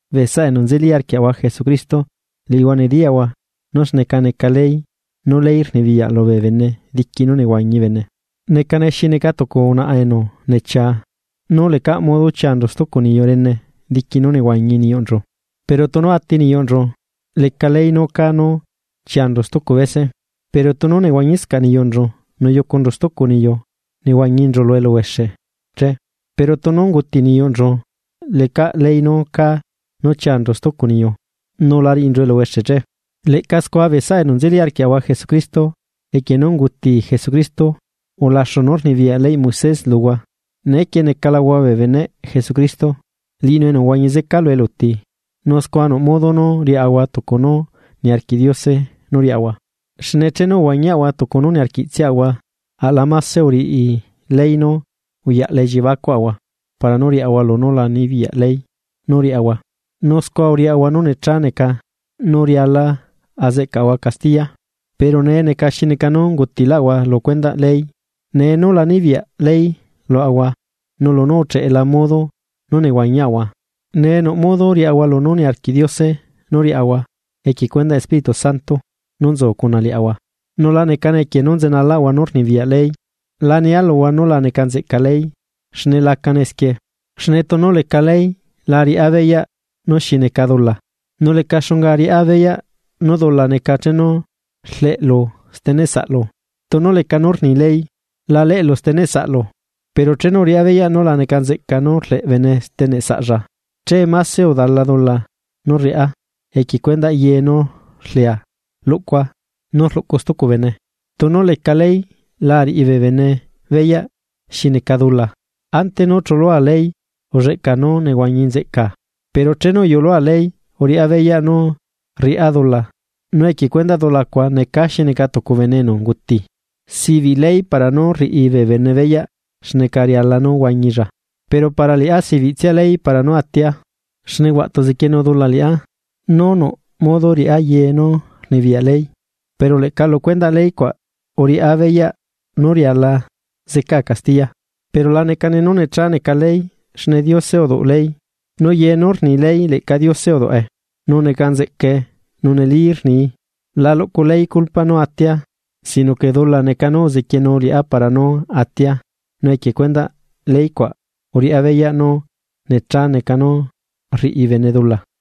Bee saꞌa enu nzeli arquiaꞌahua Jesucristo liꞌihua nediyaꞌhua nú xneca neca ley, nú ley rnibiyaꞌ lubee bene diqui nú nehuañi bene. Necane xi neca tucu unaꞌa enu nechia nú lecaꞌ modo chianchu stucu niyu rene diqui nú nehuañi niyuꞌnchu, pero tunu ati niyuꞌnchu leca ley nú cá nú chianchu stucu bese. Pero tunu nehuañiscaꞌ niyuꞌnchu nu yucunchu stucu niyu, nehuañinchu lu eluhuexe che. Pero tunu unguti niyuꞌnchu lecaꞌ ley nucá nú chianchu stucu niyu, nu la riꞌinchu eluhuexe che. Leꞌca scua bee saꞌa enu nzeli arquiaꞌahua Jesucristo, equie nú unguti Jesucristo, ulaxu nú rnibiyaꞌ leyꞌ Moisés luhua. Neequie necalahua bee beneꞌ Jesucristo. Liꞌinu enu uhuañi zeca lu eluti, nu scua nuꞌ modo nú riaꞌahua tucu nú niarquiꞌ Diose nú riaꞌahua. Xne chenu uhuañiaꞌahua tucu nú uniarquiꞌtsiaꞌahua aꞌla máse uriꞌi ley nú uyaꞌla elliebacuꞌahua para nú riaꞌahua lunú la nibiyaꞌ ley nú riaꞌahua nu scua uriaꞌahua nú necha neca nú riala azeꞌcaꞌahua castiya. Pero nee neca xi neca nú ungutilaꞌahua lu cuendaꞌ ley, nee nú la nibiyaꞌ ley luaꞌahua nu lunú ucheꞌela modo nú nehuañiaꞌahua, nee nuꞌ modo nú riaꞌahua lunú niarquiꞌ Diose nú riaꞌahua equie cuendaꞌ Espíritu Santo nú nzu cuna liaꞌahua. Nu la necane equie nú nzenalaꞌahua nú rnibiyaꞌ ley. La nia luhua nú la neca nzeꞌca ley, xne lacane esquie. Xne tunu leca ley lá ariaꞌa beyaꞌ nú xi neca dula, nu leca xunga ariaꞌa beyaꞌ nú dula neca chenu rleꞌlu steneꞌ saꞌlu, tunu leca nú rni ley: “La leꞌlu steneꞌ saꞌlu.” Pero chenu uriꞌá beyaꞌ nú la neca nzeꞌca nú rleꞌ bene steneꞌ saꞌlla che máse udala dula nú rriꞌá equie cuendaꞌ ye nú rlea luꞌcua nú rluꞌcu stucu bene. Tunu leca ley lá ariꞌi bee bene beyaꞌ xi neca dula. Ante nú chulua ley ulleꞌcaa nú nehuañi nzeꞌcaa. Pero chenu uyulua ley uriꞌá beyaꞌ nú rriꞌá dula nu equie cuendaꞌ dula cuaꞌ necaa xi neca tucu bene enu unguti. Sibiꞌ ley para nú riꞌi bee bene beyaꞌ xneca riala nú huañilla. Pero para liꞌá sibiꞌtsia ley para nú atia. Xne huaꞌtu uzequienu dula liꞌá nú nuꞌ modo riꞌá ye nú rnibiyaꞌ ley pero leꞌca lu cuendaꞌ ley cuaꞌ uriꞌá beyaꞌ nú riala zecaa castiya. Pero la necane nú necha neca ley xne Diose uduꞌ ley, nu ye nú rni ley leꞌca Diose uduꞌe, nu neca nzeꞌcae, nu neli rnii. La luꞌcu ley culpa nú atia, sino que dula neca nú uzequienu liꞌá para nú atia nu equie cuendaꞌ ley cuaꞌ uriꞌá beyaꞌ nú necha neca nú rriꞌi bene dula.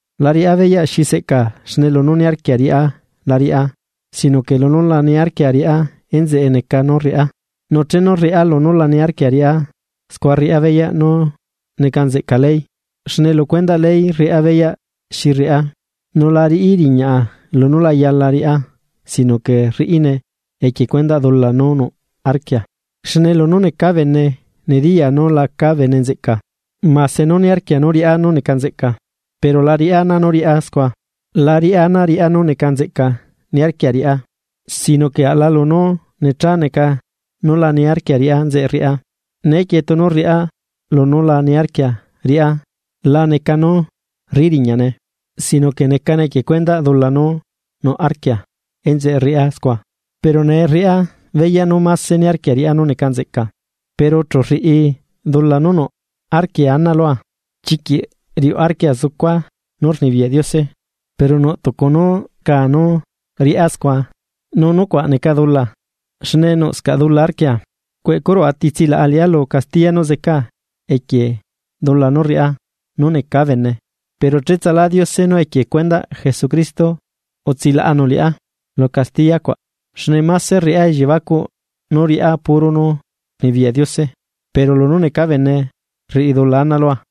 La riꞌá beyaꞌ xi seꞌca xne lunú niarquia riꞌá la riꞌá, sino que lunú laniarquia riꞌá enzeꞌe neca nú rriꞌá. Nu chenu rriꞌá lunú la niarquia riꞌá, scua rriꞌá beyaꞌ nú neca nzeꞌca ley, xne lu cuendaꞌ ley rriꞌá beyaꞌ xi rriꞌá. Nu la riꞌi riñaꞌa lunú la yala riꞌá, sino que rriꞌine equie cuendaꞌ dula nú nuꞌ arquia. Xne lunú necaa bene, nediyaa nú lacaa bene nzeꞌca, mase nú niarquia riꞌá nú neca nzeꞌca, pero la riꞌá ana nú riꞌá scua. La riꞌá ana riꞌá nú neca nzeꞌca niarquia riꞌá, sino que aꞌla lunú necha neca nú la niarquia riꞌá enzeꞌe rriꞌá. Neequie tunu rriꞌá lunú la niarquia riꞌá, la neca nú rriꞌi riñaꞌne, sino que necane equie cuendaꞌ dula nú nuꞌ arquia enzeꞌe rriꞌá scua. Pero nee rriꞌá beyaꞌ nú máse niarquia riꞌá nú neca nzeꞌca, pero chu rriꞌi dula nú nuꞌ arquia ana lua. Chiquiꞌ riuꞌ arquia zucua nú rnibiyaꞌ Diose. Pero nuꞌ tucu nú rcaa nú riꞌá scua, nu nucuaꞌ neca dula, xne nuꞌscaꞌ dula arquia. ¡Cueꞌcurua! ¿Ti tsilaꞌa liꞌá lu castiya nú zecaa equie dula nú rriꞌá nú necaa bene? ¡Pero cheꞌtsalá Diose nú equie cuendaꞌ Jesucristo utsilaꞌanu liꞌá lu castiyacuaꞌ! Xne mase rriꞌá elliebacuꞌ nú riꞌá puro nú rnibiyaꞌ Diose, pero lunú necaa bene, rriꞌi dula ana lua.